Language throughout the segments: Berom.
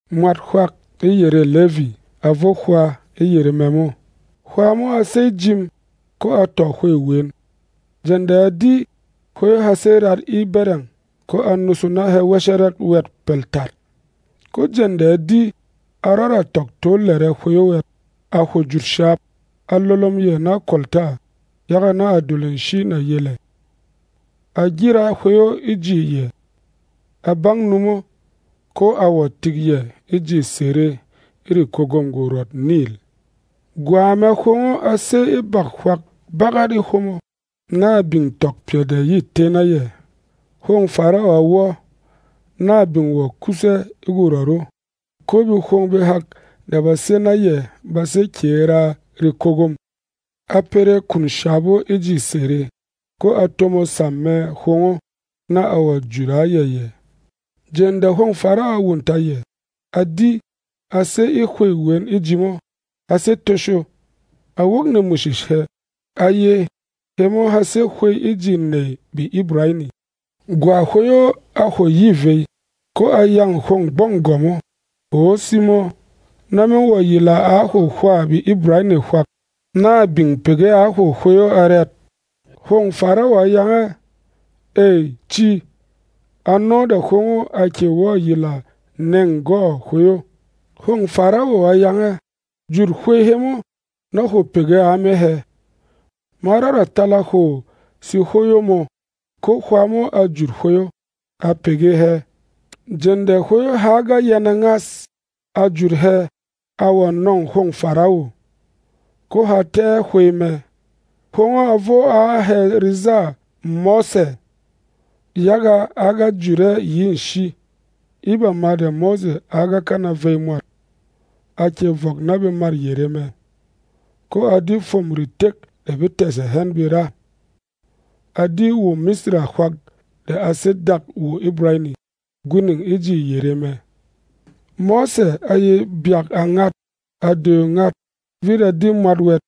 Mwat hwak e yerê Levi a vo hwā e yere mɛ mo. Hwā mo a sey jim, ko a tɔ hwey wen. Jeng de a di, hwey o ha sé rat e bɛrɛng, ko a nusu na hɛ wɛshɛrɛk wɛt pɛl tat. Ko jeng de a di, a rɔda tɔk to lɛrɛ hwey o wɛt, a hwo jut shap, a lolom yɛ na kwolta, yaga na a dul nshi nà yel ɛ. A gyira hwey o e ji yɛ, a bang nu mo, ko a wɔ̀ tik yɛ e ji sere e rekwogom Gwɔrɔt Nil. Gwa mɛ hwong o a sè e bak hwak bagat e hwomo, na a bin tɔk pyɛ de yê té na yɛ. Hwông Farawo a wɔ́, na a bin wɔ̀ kus ɛ́ e gwɔrɔt o, ko behwong behak de ba sé na yɛ ba sè kyě raa rekwogom. A pere kun shap o e ji sere, ko a tomo sam mɛ hwong o, na a wɔ̀ jut a yɛ yɛ. Jeng de hwông Farawo a wunta yɛ, a di, a sé e hwey wen e ji mo, ha sé tosho. A wok nemwishish hɛ, a ye, “Hemo ha sé hwey e ji nèy BeIbrani.” Gwa hwey o a hwo yi vey, ko a yâng hwông gbɔng gwɔ̀m o, “Hwô simo, na me wɔ̀ yila a hwo hwâ BeIbrani hwak, na a bin pege a hwo hwey o arɛt?” Hwông Farawo a yang ɛ, “Ey, ci.” Ano de hwong o a kyè wɔ̀ yila neng-gwɔ̂ hwey o. Hwông Farawo a yang ɛ, “Jut hwey hemo, na hwo pege a me hɛ. Ma rɔda tala hwo sehwoyo mō.” Ko hwā mo a jut hwey o, a pege hɛ. Jeng de hwey o ha ga yɛnɛ ngas, a jut hɛ, a wɔ̀ nɔ̂ng hwông Farawo, ko ha tɛ́ ɛ hwey mɛ. Hwong o a vo a hɛ rezâ Mose, yaga a ga jut ɛ yi e nshi. E bama de Mose a ga kana vey mwat, a kyè vɔk na bemât yere mɛ, ko a di fwôm retek de be tɛ̀sɛ hɛn be ra. A di WoMisra hwak de a sé dak WoIbrani, gwining e ji yere mɛ. Mose a ye byak a ngat, a doyo ngat, vit a di mwat wɛt,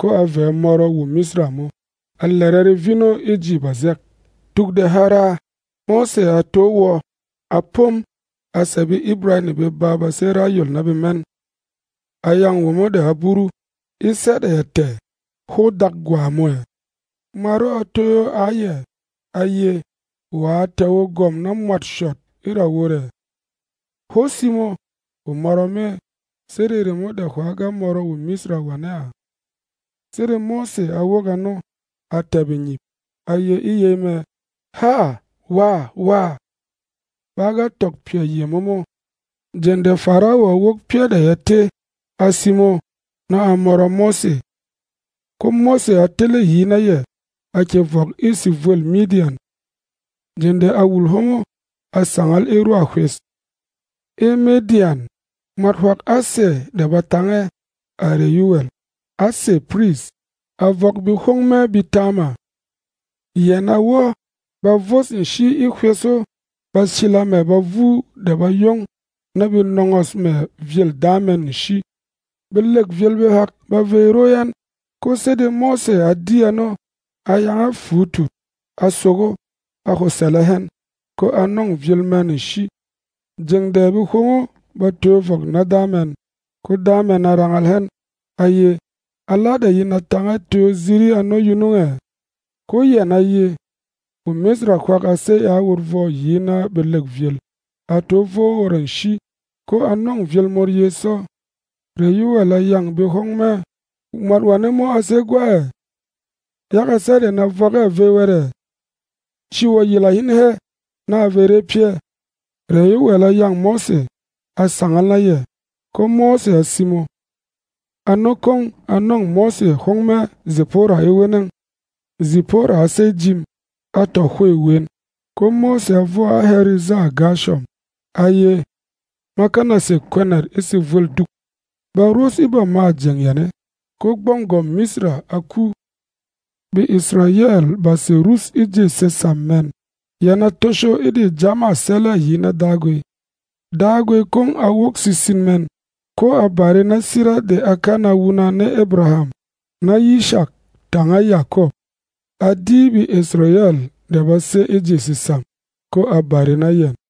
ko a vɛ̌ mɔrɔ WoMisra mo, a lɛrɛ revin o e ji bazɛk. Tuk de ha raa, Mose a to wɔ́, a pom, a sɛ̀ BeIbrani beba ba sé ra yol na bemɛn. A yâng womo de a buru, “E sɛ́ de ya tɛ̀, hwó dak gwa mō ɛ?” Mwat o a toyo a yɛ, a ye, “Wa a tɛ̀ o gwɔ̀m na mwât shɔt e ra wot ɛ? Hwó simo, hwo mɔrɔ me, sede remo de hwà ga mɔrɔ WoMisra wane a?” Sede Mose a wok ano, a tɛ̀ bengyip, a ye e yey mɛ, “Háa wàwá! Ba ga tɔk pyɛ yemo mo.” Jeng de Farawo a wok pyɛ́ de ya té, a simo, na a mɔrɔ Mose. Ko Mose a tele yi na yɛ, a kyè vɔk e sevwêl Midyan. Jeng de a wul hwomo, a sangal e rwa hwes. E Midyan, mwat hwak a sè de ba tang ɛ, à Rɛyuwɛl, a sè piris, a vɔk behwóng mɛ betaama. Yɛn a wɔ́, ba vos nshi e hwes o, ba sila mɛ bavu de ba yong, na be nɔngɔs mɛ vyêl da mɛn nshi. Belek vyēl behak ba vey ro ɛn, ko sede Mose a di ano, a yang ɛ fuutut, a sogo, a hwo sɛlɛ hɛn, ko a nɔng vyēl mɛn nshi. Jeng de behwong o ba toyo vɔk na da mɛn, ko da mɛn a rangal hɛn, a ye, “Ala de yin a tānga toyo ziri ano yunung ɛ?” Ko yɛn a ye, “WoMisra hwak a sey a wot vwɔ yi na belêk vyēl, a to vo a wot nshi, ko a nɔ̂ng vyēl mot ye sɔ.” Rɛyuwɛl a yâng behwóng mɛ, “Mwat wane mo a sé e gwa ɛ? Yaga sɛ́ de yin a vɔk ɛ vey wɛt ɛ? Ci wɔ̀ yila hin hɛ, na a vey re pyɛ́!” Rɛyuwɛl a yâng Mose, a sangal na yɛ, ko Mose a simo. Ano kwong a nɔ̂ng Mose hwóng mɛ Zipora e weneng. Zipora a sey jim, a tɔ hwey wen, ko Mose a vo a hɛ rezâ Gɛrshɔm, a ye, “Ma kana sē kwɛnɛt e sevwel duk.” Ba ros e bamâ jeng yane, ko gbɔng gwɔ̀m Misra a ku. BeIsrayɛl ba sè rus e ji sesam mɛn, yɛn a tosho e de jamâ sɛlɛ yi na Dagwi. Dagwi kwong a wok sesin mɛn, ko a bare na sira de a kana wuna na Abraham, na Yishak tanga Yakɔp. A di BeIsrayɛl de ba sé e ji sesam, ko a bare na yɛn.